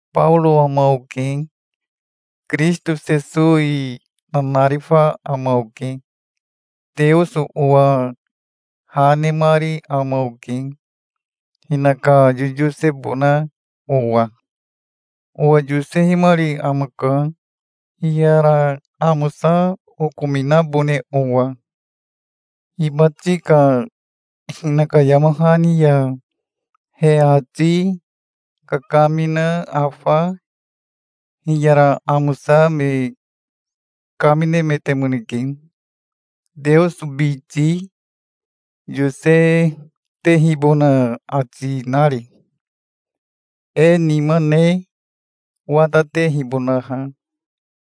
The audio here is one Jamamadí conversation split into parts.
Baoro ama oke, Kirisito Sesowi nanarifa ama oke. Teoso owa ha nemari ama oke, hinaka yoyosebona owa. Owa yosehimari amaka, hiyara amosa okominabone owa. Hibati ka hinaka yama hani ya he ati kakamina afa hiyara amosa me kaminemetemoneke, Teoso biti yosetehibona ati nari, e nima ne watatehibonaha,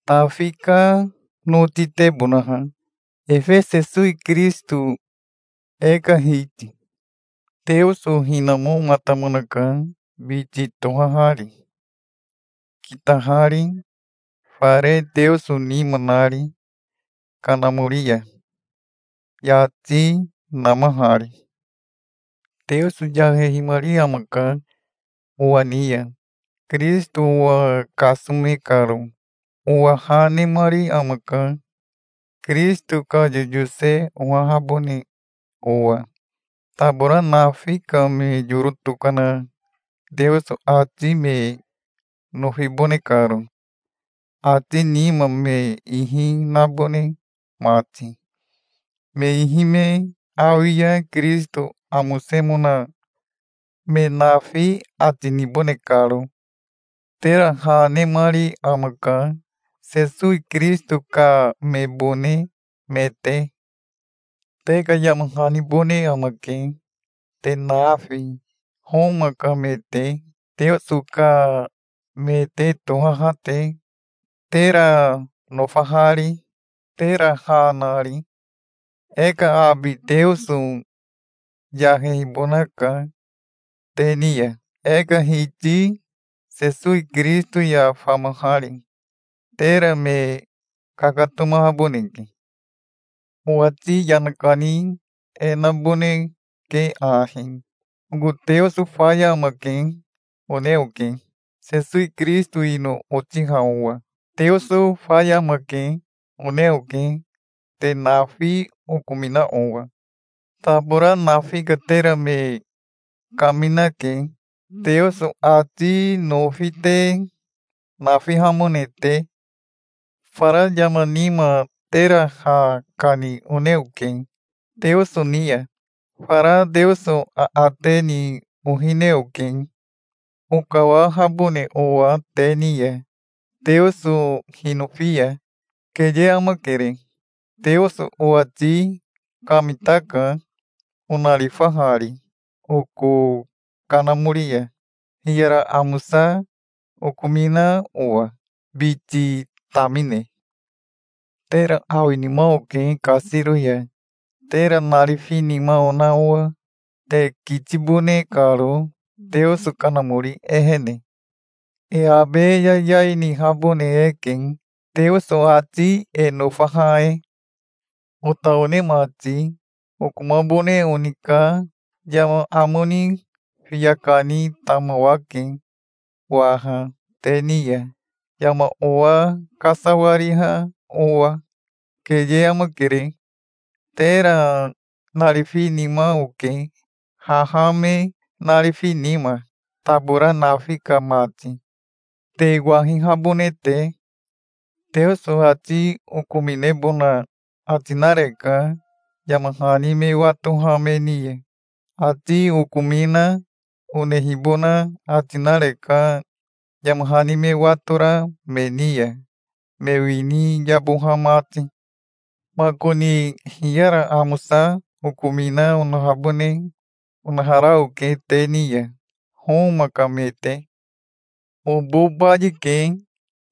Tafi ka notitebonaha, efe Sesowi Kirisito, e ka Hiti. Teoso hinamomatamonaka biti tohahari, kitahari, fare Teoso nima nari kanamori ya, yati namahari. Teoso yahehimari amaka owa ni ya, Kirisito owa kasome karo. Owa ha nemari amaka, Kirisito ka yoyose ohahabone owa, tabora nafi ka me yoro tokana Teoso ati me nofibone karo, ati nima me ihi nabone mati, me ihi me awi ya Kirisito amosemona me nafi ati nibone karo. Tera ha, nemari amaka, Sesowi Kirisito ka mebone me te. Te ka yama hanibone amake, te nafi, Homa ka me te, Teoso ka me te tohaha te, tera nofahari, tera ha nari. E ka abi Teoso yahehibonaka te ni ya, e ka Hiti Sesowi Kirisito ya famahari. Tera me kakatomahaboneke. Owati yana kani e naboneke ahi: "Oko Teoso faya amake", one oke, Sesowi Kirisito ino otiha owa. "Teoso faya amake", one oke, te nafi okomina owa. Tabora nafi ka tera me kaminake, Teoso ati nofi te nafihamone te. Fara yama nima tera ha kani one oke Teoso ni ya. Fara Teoso aate ni ohine oke, okawahabone owa te ni ya, Teoso hinofi ya. Keye amakere. Teoso owati kamitaka, onarifahari oko kanamori ya, hiyara amosa okomina owa, biti tamine. Tera awinima oke kasiro ya, tera narifinima ona owa, te kitibone karo Teoso Kanamori ehene. E abe yayai nihabone eke, Teoso ati e nofaha e. Ota one mati, okomabone oni ka yama amo ni fiya kani tamawake waha te ni ya, yama owa kasawariha owa. Keye amakere. Tera narifinima oke, haha me narifi nima, tabora nafi ka mati, te wahihabone te. Teoso ati okominebona ati nareka yama hani me watoha me ni ya. Ati okomina onehibona ati nareka, yama hani me watora me ni ya, me wini yaboha mati. Makoni hiyara amosa okomina onahabone onahara oke te ni ya, Homa ka me te. Obo bayike,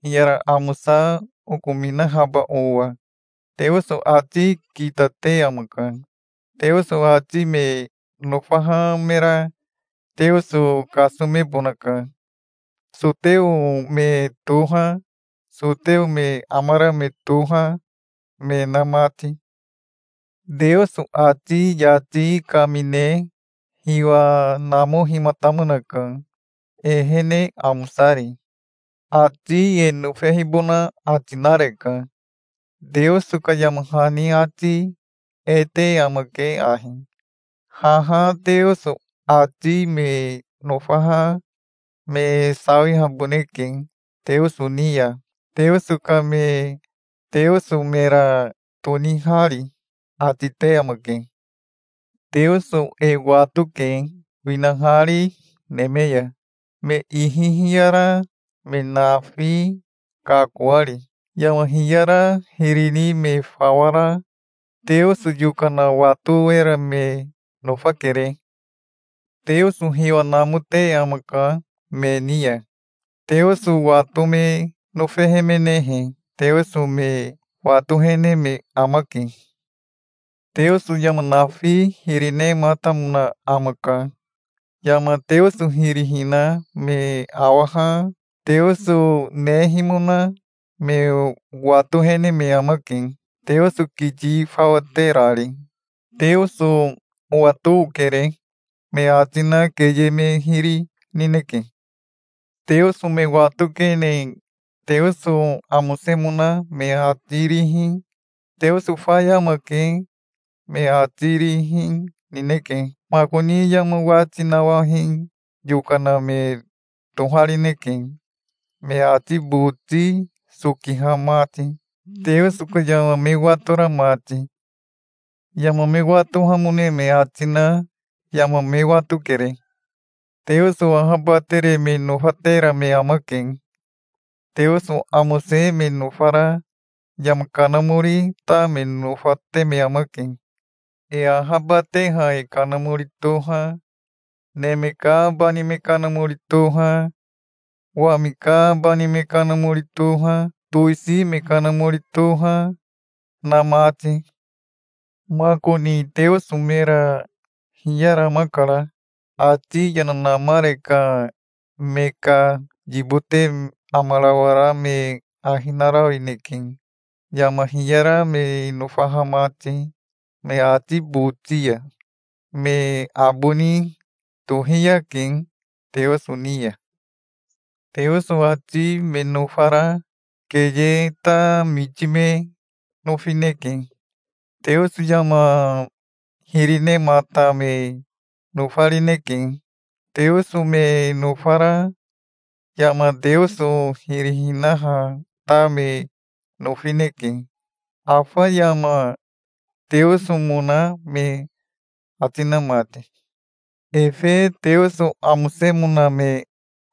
hiyara amosa okominahaba owa. Teoso ati kitate amaka. Teoso ati me nofaha mera Teoso kasomebonaka, soteo me toha, soteo me amara me toha, me na mati. Teoso ati yati kamine hiwa namohimatamonaka, ehene amosari. Ati e nofehibona ati nareka. Teoso ka yama hani ati e te amake ahi: "Haha Teoso ati me nofaha me sawihaboneke Teoso ni ya, Teoso ka me Teoso mera tonihari", ati te amake. Teoso e watoke, winahari neme ya, me ihi hiyara me nafi kakoari. Yama hiyara hiri ni me fawa ra Teoso yokana wato era me nofakere. Teoso hiwa namote amaka me ni ya. Teoso wato me nofehemenehe Teoso me watohene me amake. Teoso yama nafi hiri nematamona amaka. Yama Teoso hiri hina me awaha Teoso nehimona me watohene me amake, Teoso kiti fawa terari. "Teoso owato okere", me ati na keye me hiri nineke. Teoso me watokene Teoso amosemona me ati rihi, "Teoso faya amake", me ati rihi nineke. Makoni yama wati nawahi yokana me toharineke, me ati boti sokiha mati, Teoso ka yama me watora mati. Yama me watohamone me ati na yama me watokere. Teoso ahabatere me nofatera me amake. Teoso amose me nofara yama kanamori ta me nofate me amake, e ahabateha e kanamori toha, neme ka bani me kanamori toha, wami ka bani me kanamori toha, towisi me kanamori toha, na mati. Makoni Teoso mera hiyaramakara. Ati yana namare ka me ka yibote amarawara me ahi narawineke, yama hiyara me nofaha mati me ati boti ya. Me aboni tohiyake Teoso ni ya. Teoso ati me nofara keye ta miti me nofineke. Teoso yama hiri nemata me nofarineke. Teoso me nofara yama Teoso hiri hinaha ta me nofineke, afa yama Teosomona me ati na mati. Efe Teoso amosemona me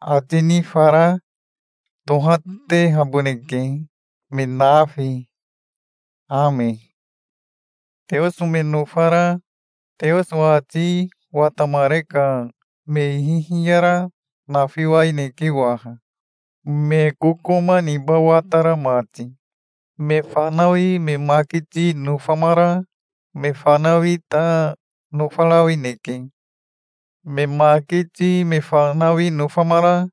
ati ni fara tohatehaboneke, me nafi. Ame. Teoso me nofara Teoso ati watamare ka me ihi hiyara nafiwaineke waha, me kokoma niba watara mati. Me fanawi me makiti nofamara me fanawi ta nofarawineke. Me makiti me fanawi nofamara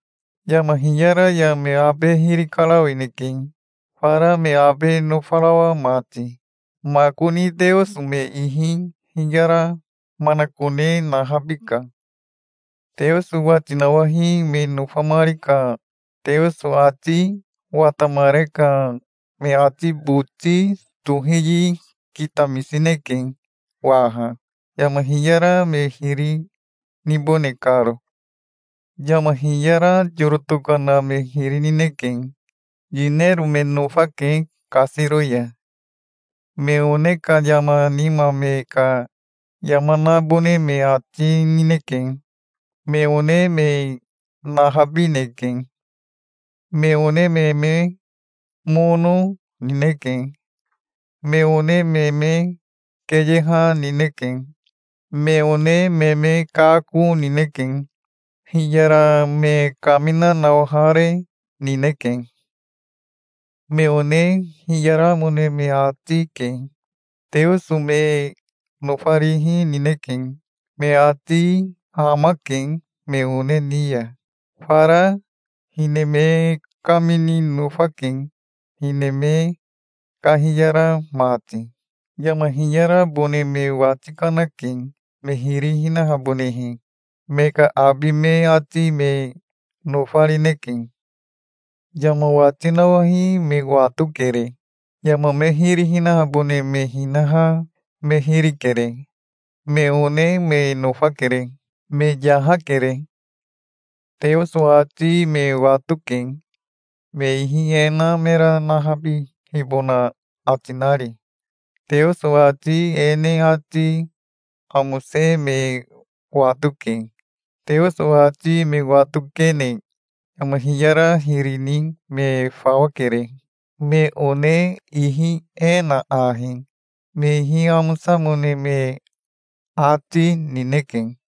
yama hiyara ya me abe hiri karawineke, fara me abe nofarawa mati. Makoni Teoso me ihi hiyara manakone nahabika. Teoso wati nawahi me nofamari ka Teoso ati watamare ka me ati boti tohiyi kitamisineke waha, yama hiyara me hiri nibone karo. Yama hiyara yoro tokana me hiri nineke. Yinero me nofake kasiro ya. Me one ka yama nima me ka yama nabone me ati, nineke. Me one me nahabineke. Me one me me mono, nineke. Me one me me keyeha nineke. Me one me me kako nineke. Hiyara me kamina nawahare, nineke. Me one hiyaramone me ati, ke. Teoso me nofarihi nineke. Me ati hamake me one ni ya. Fara hine me kamini nofake, hine me kahiyara mati. Yama hiyarabone me wati kanake, me hiri hinahabonehe. Me ka abi me ati me nofarineke. Yama wati nawahi me watokere. Yama me hiri hinahabone me hinaha me hiri kere. Me one me nofakere. Me yahakere. Teoso ati me watoke, me ihi e na mera nahabihibona ati nari. Teoso ati e ne ati amose me watoke. Teoso ati me watokene yama hiyara hiri ni me fawa kere. Me one ihi e na ahi me ihi amosamone me ati, nineke.